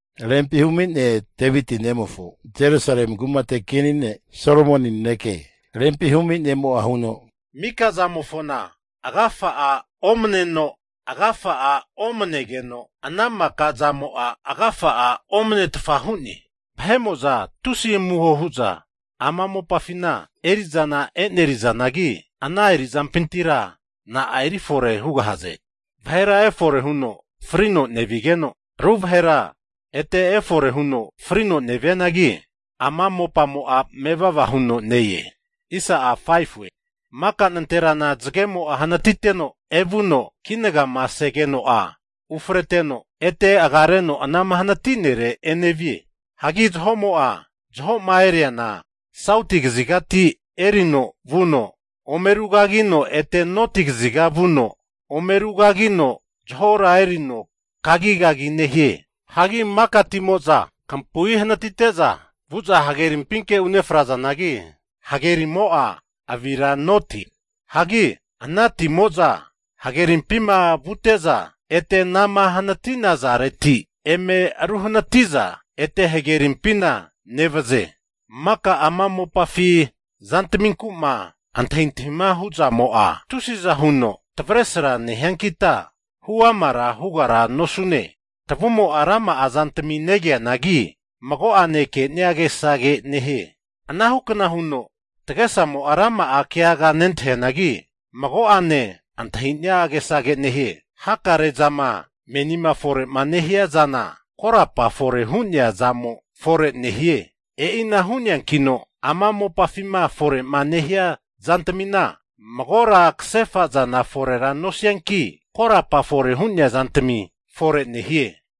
Rempi humi ne' Deviti nemofo Jerusalemi kumate kini ne' Solomoni naneke. Rempi humi ne'mo'a huno, Mika zamofona agafa'a omaneno! Agafa'a omanegeno, ana maka zamo'a agafa'a omnetfa hu'ne. Vahe'mo'za tusi amuho hu'za ama mopafina eri'zana e'nerizanagi, ana eri'zampintira na'a erifore hugahaze? Vahera efore huno frino nevanigeno, ru vahera ete efore huno frino nevianagi, ama mopamo'a mevava huno ne-e. Maka nanterana zagemo'a hanatiteno evuno kinagama segeno'a ufreteno, ete agareno anama hanati'nere enevie. Hagi zaho'ma eriana sauti kazigati erino vuno ome arugagino, ete noti kaziga vuno ome arugagino, zahora erino kagigagi nehie. Hagi maka timo'za kampui hanatite'za vu'za hagerimpinke unefrazanagi, hagerimo'a avira note. Hagi ana timo'za hagerimpima vute'za, ete anama hanati'nazareti eme aru hanati'za ete hagerimpina nevaze. Maka ama mopafi zantaminku'ma antahintahima hu'zamo'a, tusiza huno tavesra nehiankita hu amara hugara nosune. Tavumo'a rama'a zantmi negeanagi, mago'ane ke'nia agesage nehie. Anahukna huno tagesamo'a rama'a keaga nentahianagi, mago'ane antahinia agesage nehie. Hakare zama menima fore'ma nehia zana, korapa fore hu'nea zamo fore nehie. E'ina hu'neankino ama mopafima fore'ma nehia zantamina magora kasefa zana forera nosianki, korapa fore hu'nea zantmi fore nehie.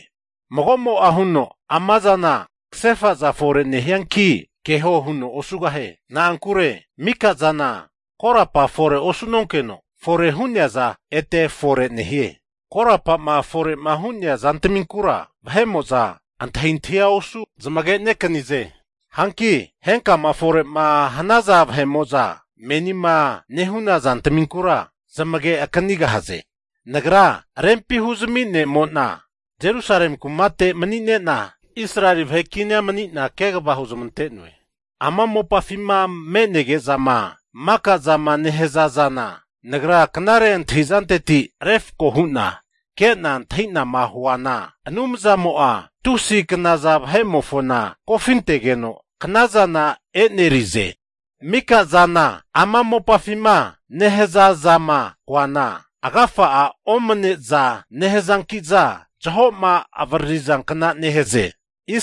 Mago'mo'a huno amazana kasefaza fore nehianki keho huno osugahie. Na'ankure mika'zana korapa fore osu'nonkeno fore hu'neaza ete fore nehie. Korapama fore'ma hu'nea zantaminkura antahintahia osu zamagenekanize. Hanki henkama fore'ma hanaza vahe'mo'za menima nehu'na zantaminkura zamage akanigahaze. Nagra Rempi huzmi ne'mo'na Jerusalemi kumate mani'ne'na, Israeli vahe kinia mani'na kegava huzmante'noe. Ama mopafima me'nege'zama maka zama nehaza zana, nagra knare antahi'zanteti, refako hu'na ke'na antahi'nama huana Anumzamo'a tusi knaza vahe'mofona kofintegeno, knazana e'nerize. Mika zana ama mopafima nehaza zama koana, agafa'a omane'za nehazanki'za, zaho'ma avararizankna nehaze.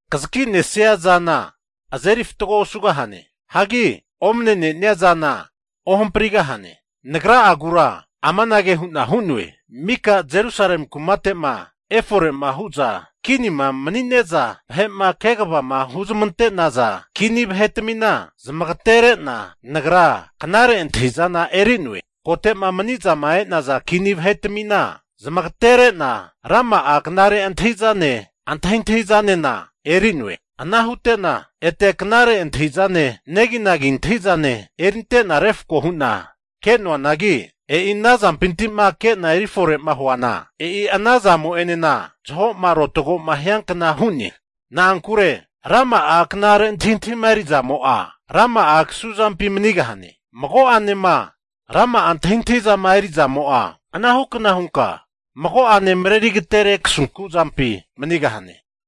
Kazakinesia zana azeri fatgo osugahane. Hagi omne'nenia zana ohamprigahane. Nagra'agura amanage hu'na hu'noe, mika Jerusalemi kumate'ma efore'ma hu'za kinima mani'ne'za vahe'ma kegavama huzmante'naza, kini vahetmina zamagatere'na nagra knare antahi'zana eri'noe. Kote'ma mani'zama e'naza kini vahetmina zamagatere'na, rama'a knare antahi'zane, antahintahizanena eri'noe. Ana hute'na ete knare antahi'zane neginagi antahi'zane erinte'na refko hu'na ke'noanagi, e'i ana zampinti'ma ke'na eri fore'ma huana, e'i ana zamo'enena zaho'ma arotagoma hiankna hu'ne. Na'ankure rama'a knare antahintahima eri zamo'a rama'a kasu zampi manigahane, mago'anema rama'a antahintahi zama eri'zamo'a anahukna hunka mago'ane mareri agatere kasunku zampi manigahane.